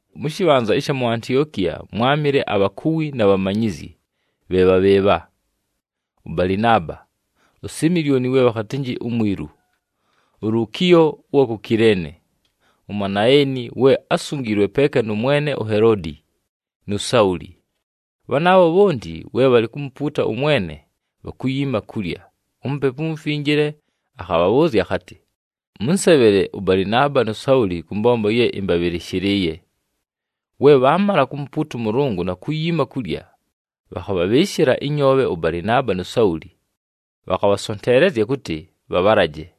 Mʉ shɨbhanza ɨsha mu Antiokiya mwámɨle abhakuwi na bhamanyizyi, bhe bha bhɨɨbha: ʉBalɨnaaba, uSimilyoni we bhakhatɨnjɨ uMwilu, uLukiyo ʉwa ku Kileene, uManaeni we ásungiilwe peeka nʉ mwene uHeloodi, nu Sauli. Bhanaabho bhonti we bhalɨ kumupuuta ʉMwene, bhakuyiima kulya, uMupepu uMufinjile akhabhabhʉʉzya akhatɨ, “Mʉnsebhele ʉBalɨnaaba nu Sauli kʉ mbombo ye ɨmbabhɨlɨshɨlɨɨye.” We bhaamala kumupuuta ʉMʉlʉngʉ na kuyiima kulya, bhakhabhabhɨɨshɨla ɨnyoobhe ʉBalɨnaaba nu Sauli, bhakhabhasonteelezya kʉtɨ bhabhalaje.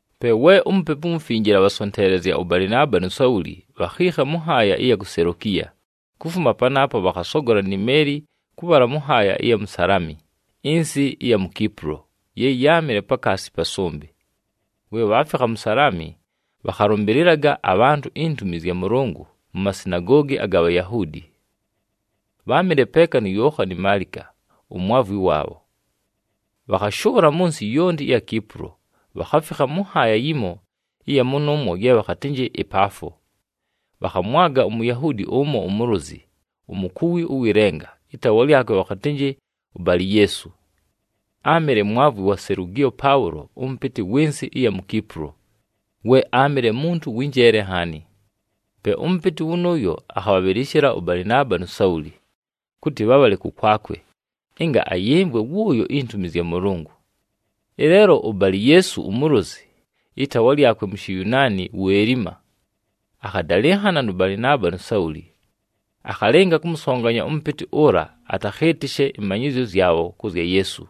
Pe we uMupepu uMufinjile abhasonteelezya ʉBalɨnaaba nu Sauli, bhakhiikha mʉ nhaaya ɨya ku Selokiya. Kufuma panaapo bhakhasogola ni meeli kʉbhala mʉ nhaaya ɨya mu Salami ɨnsɨ ɨya mu Kipulo ye yáamɨle pakaasi pa sʉmbɨ. We bhaafikha mu Salami, bhakhalʉmbɨlɨlaga abhantʉ intumi zya Mʉlʉngʉ mu masinagoogi aga Bhayahuudi. Bháamɨle peeka nu Yookhani Maalika, umwavwi waabho. Bhakhashʉʉla mʉ nsɨ yonti ɨya Kipulo, bhakhafikha mʉ nhaaya yimo ɨya mʉnʉʉmwo ye bhakhatɨnjɨ ɨPaafo. Bhakhamwaga uMuyahuudi ʉmo umulozi, umukuwi ʉwɨ lenga, ɨtaawa lyakwe bhakhatɨnjɨ uBali-Yeesu. Áamɨle mwavwi wa Selugiyo Paʉlo ʉmʉpɨtɨ wɨ nsɨ ɨya mu Kipulo, we áamɨle muntu wɨ njeele nhaani. Pe ʉmʉpɨtɨ wʉnʉʉyo akhabhabhɨlɨshɨla ʉBalɨnaaba nu Sauli, kʉtɨ bhabhale kʉkwakwe ɨnga ayɨmvwe wʉʉyo intumi zya Mʉlʉngʉ. Ɨleelo uBali-Yeesu umulozi, ɨtaawa lyakwe mu Shiyunaani wu Elima, akhadalɨnhana nʉ Balɨnaaba nu Sauli, akhalɨnga kʉmʉsonganya ʉmʉpɨtɨ ʉla atakhɨɨtɨshe ɨmanyɨzyo zyabho kʉ zya Yeesu.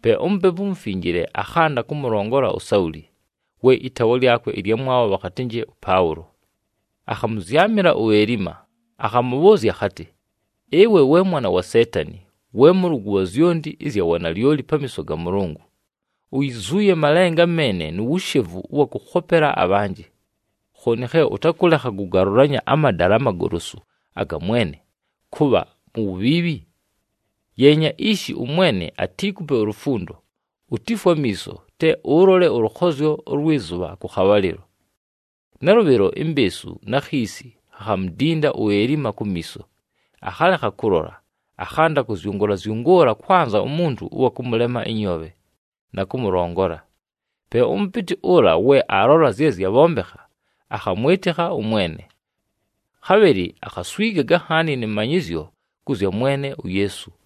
Pe uMupepu uMufinjile akhanda kʉmʉlongola uSauli, we ɨtaawa lyakwe ɨlyamwabho bhakhatɨnjɨ ʉPaʉlo. Akhamʉzyamɨla uElima, akhamʉbhʉʉzya akhatɨ, “Ɨwe we mwana wa Seetani, we mʉlʉgʉ wa zyonti ɨzya wanalyoli pamiiso ga Mʉlʉngʉ! Uyizuuye malenga meene nu wushevu ʉwa kʉkhopela abhanjɨ. Khooni khe ʉtakʉlekha kʉgalʉlanya amadala amagolosu aga Mwene, kʉbha mu wubhiibhi? Yeenya ishi, ʉMwene atiikupe ulufundo, utifwe amiiso, te ʉlole ʉlʉkhozyo ʉlwɨ zʉbha kʉ khabhalɨlo.” Nalʉbhɨlo, imbeesu na khiisi khakhamudinda uElima kumiiso, akhalekha kʉlola, akhanda kʉzyʉngʉʉla-zyʉngʉʉla kwanza umuntu ʉwa kʉmʉlema ɨnyoobhe, na kʉmʉlongola. Pe ʉmʉpɨtɨ ʉla we aalola zye zyabhombekha, akhamwɨtɨkha ʉMwene. Khabhɨlɨ akhaswigaga nhaani nɨ manyɨzyo kʉ zya Mwene uYeesu.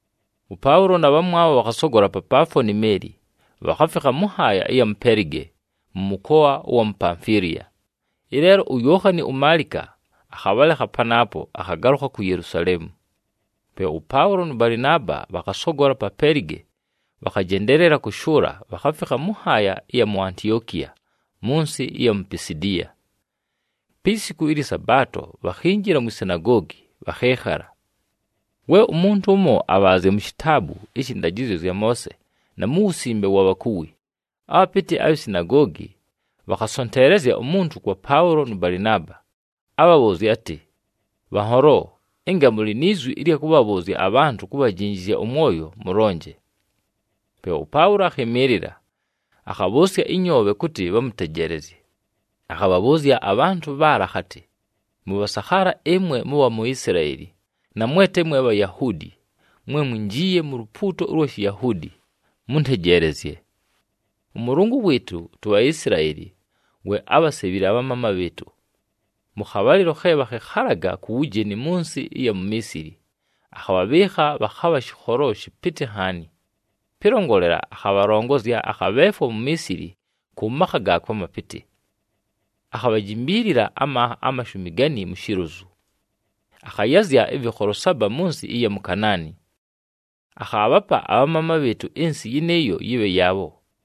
ɄPaʉlo na bhamwabho bhakhasogola pa Paafo ni meeli, bhakhafikha mʉ nhaaya ɨya mu Pelige mʉ mʉkoa ʉwa mu Pamfiliya. Ɨleelo uYookhani uMaalika akhabhalekha panaapo, akhagalʉkha ku Yelusaleemu. Pe ʉPaʉlo nʉ Balɨnaaba bhakhasogola pa Pelige, bhakhajendeelela kʉshʉʉla, bhakhafikha mʉ nhaaya ɨya mu Antiokiya mʉ nsɨ ɨya mu Pisidiya. Pi siku ɨlyɨ Sabaato, bhakhinjila mwi sinagoogi, bhakhɨɨkhala. We umuntu ʉmo abhaazya mu shitaabu ɨshɨ ndajɨzyo zya Moose, na mu wusimbe wa bhakuwi, abhapɨtɨ abhi sinagoogi bhakhasonteelezya umuntu kwa Paʉlo nʉ Balɨnaaba, abhabhʉʉzye atɨ, “Bhanholo, ɨnga mʉlɨ ni zwi ɨlya kʉbhabhʉʉzya abhantʉ kubhajinjizya ʉmwoyo mʉlonje.” Pe ʉPaʉlo akhɨmɨɨlɨla, akhabhʉʉsya ɨnyoobhe kʉtɨ bhamʉtejeelezye, akhabhabhʉʉzya abhantʉ bhaala akhatɨ, “Mʉbhasakhaala ɨmwe mʉbha mu Isilaeli, na mwe te mwe Bhayahuudi mwe mwinjiiye mu lupuuto ʉlwa Shiyahuudi, mʉntejeelezye! ɄMʉlʉngʉ wɨɨtʉ tuBhaisilaeli we ábhasebhile abhamaama bhɨɨtʉ. Mʉ khabhalɨlo khe bhakhɨkhalaga ku wujeni mʉ nsɨ ɨya mu Miisili, akhabhabhɨɨkha bhakhabha shɨkholo shɨpɨtɨ nhaani. Pɨlongolela, akhabhalongozya, akhabheefwa mu Miisili kʉ makha gaakwe amapɨtɨ. Akhabhajimbiilila amanha amashumi gani mu shilozu. Akhayazya ɨvɨkholo saba mʉ nsɨ ɨya mu Kanaani, akhaabhapa abhamaama bhɨɨtʉ ɨnsɨ yɨnɨɨyo yɨbhe yaabho.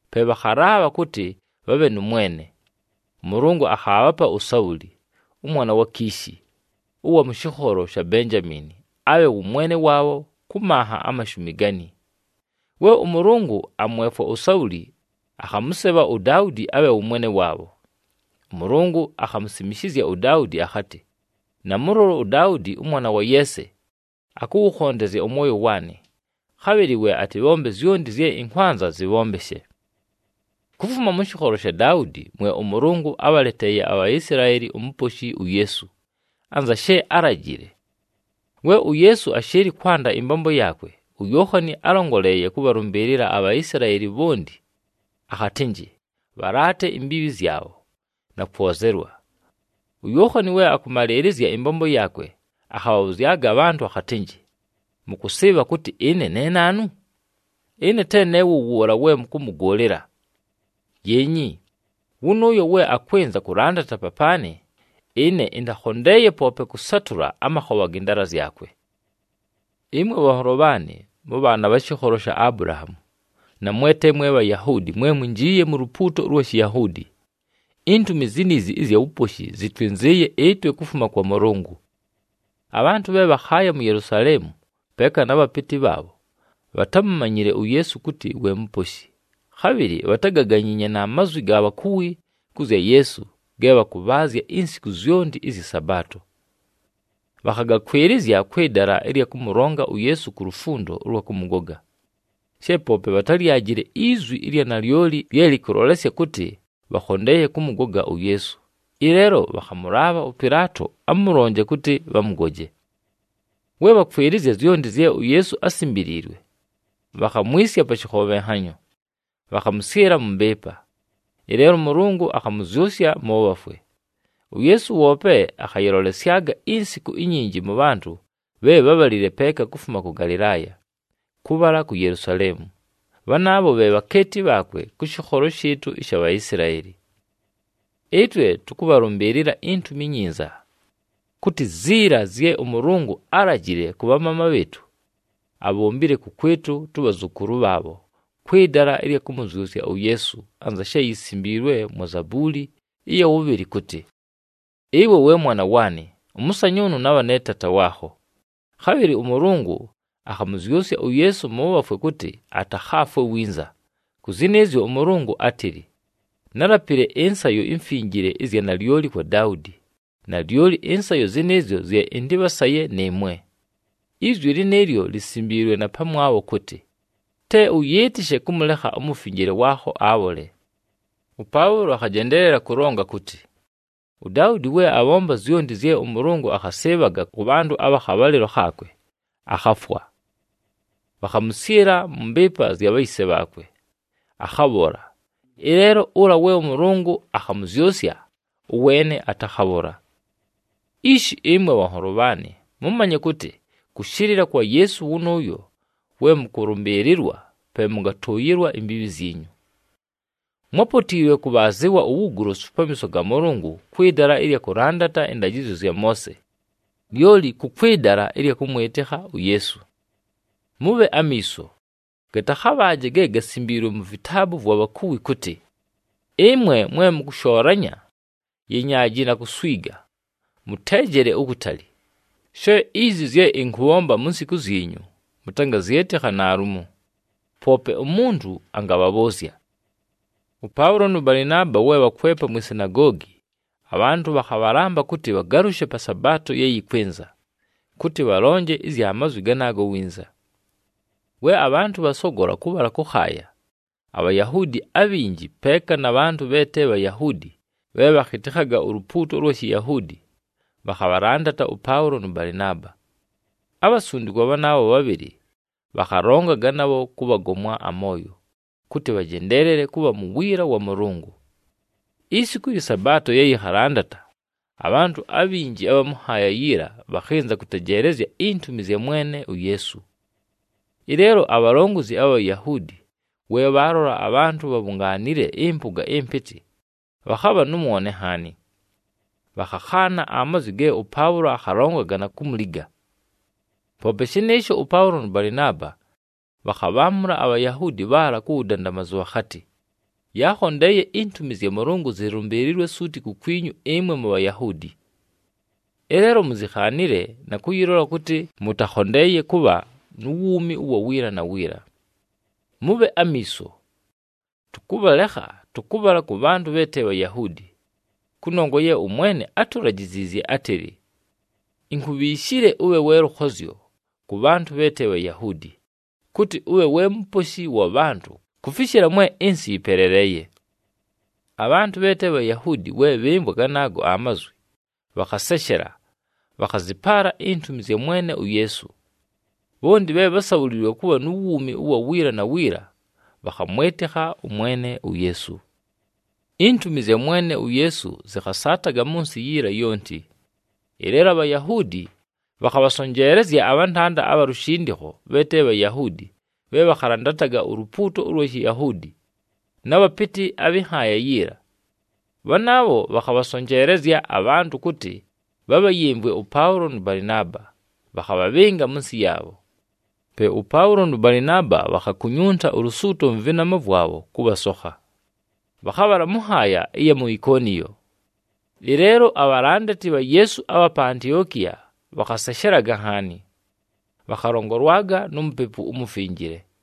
Pe bhakhalaabha kʉtɨ bhabhe nʉ mwene. ɄMʉlʉngʉ akhaabhapa uSauli, ʉmwana wa Kishi, ʉwa mʉ shɨkholo sha Benjamiini abhe wʉ mwene waabho kʉ manha amashumi gani. We ʉMʉlʉngʉ amwefwa uSauli, akhamʉsebha uDaudi abhe wʉ mwene waabho. ɄMʉlʉngʉ akhamusimishizya uDaudi akhatɨ, ‘Namʉlola uDaudi ʉmwana wa Yeese, akʉwʉkhondezya ʉmwoyo waanɨ, khabhɨlɨ we atɨbhombe zyonti zye ɨnkwanza zɨbhombeshe.’ “Kufuma mʉ shɨkholo sha Daudi mwe ʉMʉlʉngʉ ábhaleteeye aBhaisilaeli uMuposhi uYeesu, anza she álajile. We uYeesu ashɨɨlɨ kwanda ɨmbombo yaakwe, uYookhani álongoleeye kʉbhalʉmbɨɨlɨla aBhaisilaeli bhonti akhatɨnjɨ bhalaate imbiibhi zyabho, na kwozelwa. UYookhani we akʉmalɨɨlɨzya ɨmbombo yaakwe, akhabhabhʉzyaga abhantʉ akhatɨnjɨ, ‘Mʉkʉsɨɨbha kʉtɨ ɨne ne naanu? Ɨne te ne wʉ wʉʉla we mʉkʉmʉgʉʉlɨla! Yeenyi, wʉnʉʉyo we akwɨnza kʉlandata papaanɨ, ɨne ɨntakhondeeye poope kʉsatʉla amakhobha gɨ ndaala zyakwe.’ “Ɨmwe bhanholo bhaanɨ, mʉbhaana abha shɨkholo sha Abulahaamu, na mwe te mwe Bhayahuudi mwe mwinjiiye mu lupuuto ʉlwa Shiyahuudi, intumi ziniizi ɨzya wuposhi zɨtwɨnzɨɨye ɨtwe kufuma kwa Mʉlʉngʉ. Abhantʉ bhe bhakhaaya mu Yelusaleemu peeka na bhapɨtɨ bhaabho bhatámumanyile uYeesu kʉtɨ we Muposhi, khabhɨlɨ bhatágaganyiinye na mazwi ga bhakuwi kʉ zya Yeesu ge bhakʉbhaazya insiku zyonti ɨzyɨ Sabaato. Bhakhagakwɨlɨzya kwɨ dala ɨlya kʉmʉlonga uYeesu ku lufundo ʉlwa kʉmʉgoga. She poope bhatályajile izwi ɨlya nalyoli lye lɨkʉlolesya kʉtɨ bhakhondeeye kʉmʉgoga uYeesu, ɨleelo bhakhamʉlaabha ʉPɨlaato amʉlonje kʉtɨ bhamʉgoje. We bhakwɨlɨzya zyonti zye uYeesu ásimbiliilwe, bhakhamwisya pa shɨkhobhenhanyo, bhakhamʉsyɨla mʉ mbɨɨpa. Ɨleelo ʉMʉlʉngʉ akhamʉzyʉsya mʉ bhafwe. UYeesu woope akhayɨlolesyaga insiku inyinji mʉ bhantʉ bhe bhábhalile peeka kufuma kʉ Galɨlaaya, kʉbhala ku Yelusaleemu. Bhanaabho bhe bhakeeti bhaakwe kʉ shɨkholo shɨɨtʉ ɨsha Bhaisilaeli. “Ɨtwe tʉkʉbhalʉmbɨɨlɨla iNtumi iNyinza, kʉtɨ ziila zye ʉMʉlʉngʉ álajile kʉ bhamaama bhɨɨtʉ, abhombile kʉkwɨtʉ tʉbhazʉkʉlʉ bhaabho kwɨ dala ɨlya kʉmʉzyʉsya uYeesu, anza she yisimbiilwe mwa Zabuuli ɨya wʉbhɨlɨ kʉtɨ, ‘Ɨwe we Mwana waanɨ, ʉmʉsanyʉʉnʉ nabha ne Taata waakho.’ Khabhɨlɨ ʉMʉlʉngʉ akhamʉzyʉsya uYeesu mʉ bhafwe kʉtɨ atakhaafwe winza. Kʉ zɨnɨɨzyo ʉMʉlʉngʉ átɨlɨ, ‘Nálapile ɨnsayo imfinjile ɨzya nalyoli kwa Daudi, nalyoli ɨnsayo zɨnɨɨzyo zye ɨntɨbhasaye nɨɨmwe.’ “Izwi lɨnɨɨlyo lisimbiilwe na pamwabho kʉtɨ, ‘Te ʉyɨɨtɨshe kʉmʉlekha uMufinjile waakho, abhole.’” ɄPaʉlo akhajendeelela kʉlonga kʉtɨ, “UDaudi we abhomba zyonti zye ʉMʉlʉngʉ akhasɨɨbhaga kʉ bhantʉ abha khabhalɨlo khaakwe, akhafwa. Bhakhamʉsyɨla mʉ mbɨɨpa zya bhayise bhaakwe, akhabhola. Ɨleelo ʉla we ʉMʉlʉngʉ akhamʉzyʉsya, ʉweene atakhabhola. “Ishi ɨmwe bhanholo bhaanɨ, mʉmanye kʉtɨ kʉshɨlɨla kwa Yeesu wʉnʉʉyo we mʉkʉlʉmbɨɨlɨlwa pe mʉngatʉʉyɨlwa imbiibhi zyinyu. Mwápotiilwe kʉbhaazɨwa uwugolosu pamiiso ga Mʉlʉngʉ kwɨ dala ɨlya kʉlandata ɨndajɨzyo zya Moose, lyoli kʉ kwɨ dala ɨlya kʉmwɨtɨkha uYeesu. Mʉbhe amiiso, gatakhabhaaje ge gasimbiilwe mu vitaabu vwa bhakuwi kʉtɨ, ‘Ɨmwe mwe mʉkʉshoolanya, yenyaaji na kuswiga, mʉteejele ukutali. She izi zye ɨnkʉbhomba mu nsiku zyinyu mʉtangazyɨtɨkha naalumo, poope umuntu angabhabhʉʉzya!’” ɄPaʉlo nʉ Balɨnaaba, we bhakwepa mwi sinagoogi, abhantʉ bhakhabhalamba kʉtɨ bhagalʉshe pa Sabaato ye yɨkwɨnza, kʉtɨ bhalonje ɨzya mazwi ganaago winza. We abhantʉ bhasogola kʉbhala kʉkhaaya, aBhayahuudi abhinji, peeka na bhantʉ bhe te Bhayahuudi bhe bhakhɨtɨkhaga ulupuuto ʉlwa Shiyahuudi, bhakhabhalandata ʉPaʉlo nʉ Balɨnaaba. Abhasundikwa bhanaabho bhabhɨlɨ bhakhalongaga nabho kʉbhagomwa amooyo, kʉtɨ bhajendeelele kʉbha mu wiila wa Mʉlʉngʉ. Isiku ɨlyɨ Sabaato ye yɨkhalandata, abhantʉ abhinji abha mʉ nhaaya yiila bhakhɨnza kʉtejeelezya intumi zya Mwene uYeesu. Ɨleelo abhalongozi abha Bhayahuudi we bhaalola abhantʉ bhabhungaanile ɨmpʉga ɨmpɨtɨ, bhakhabha nʉ mwone nhaani. Bhakhakhaana amazwi ge ʉPaʉlo akhalongaga na kumuliga. Poope shɨnɨɨsho, ʉPaʉlo nʉ Balɨnaaba bhakhabhaamʉla aBhayahuudi bhaala ku wudandamazu bhakhatɨ, “Yaakhondeeye intumi zya Mʉlʉngʉ zɨlʉmbɨɨlɨlwe suuti kukwinyu ɨmwe muBhayahuudi. Ɨleelo muzikhaanile, na kʉyɨlola kʉtɨ mʉtakhondeeye kʉbha nu wuumi ʉwa wiila na wiila. Mʉbhe amiiso! Tʉkʉbhalekha, tʉkʉbhala kʉ bhantʉ bhe te Bhayahuudi. Kʉnongwa ye ʉMwene átulajiziizye átɨlɨ, ‘Inkubhiishile ʉbhe we lʉkhozyo kʉ bhantʉ bhe te Bhayahuudi, kʉtɨ ʉbhe we muposhi wa bhantʉ kufishila mwe ɨnsɨ yɨpeleleeye.’” Abhantʉ bhe te Bhayahuudi, we bhɨmvwa ganaago amazwi, bhakhaseshela, bhakhazɨpaala intumi zya Mwene uYeesu. Bhonti bhe bhásabhuliilwe kʉbha nu wuumi ʉwa wiila na wiila, bhakhamwɨtɨkha ʉMwene uYeesu. Intumi zya Mwene uYeesu zɨkhasaataga mʉ nsɨ yiila yonti. Ɨleelo aBhayahuudi bhakhabhasonjeelezya abhantanda abha lushindikho bhe te Bhayahuudi bhe bhakhalandataga ulupuuto ʉlwa Shiyahuudi, na bhapɨtɨ abhɨ nhaaya yiila. Bhanaabho bhakhabhasonjeelezya abhantʉ kʉtɨ bhabhayɨmvwe ʉPaʉlo nʉ Balɨnaaba, bhakhabhabhɨnga mʉ nsɨ yaabho. Pe ʉPaʉlo nʉ Balɨnaaba bhakhakunyunta ulusuuto mʉ vɨnama vwabho kʉbhasokha, bhakhabhala mʉ nhaaya ɨya mu Ikoniyo. Ɨleelo, abhalandati bha Yeesu abha pa Antiokiya bhakhaseshelaga nhaani, bhakhalongolwaga nu Mupepu uMufinjile.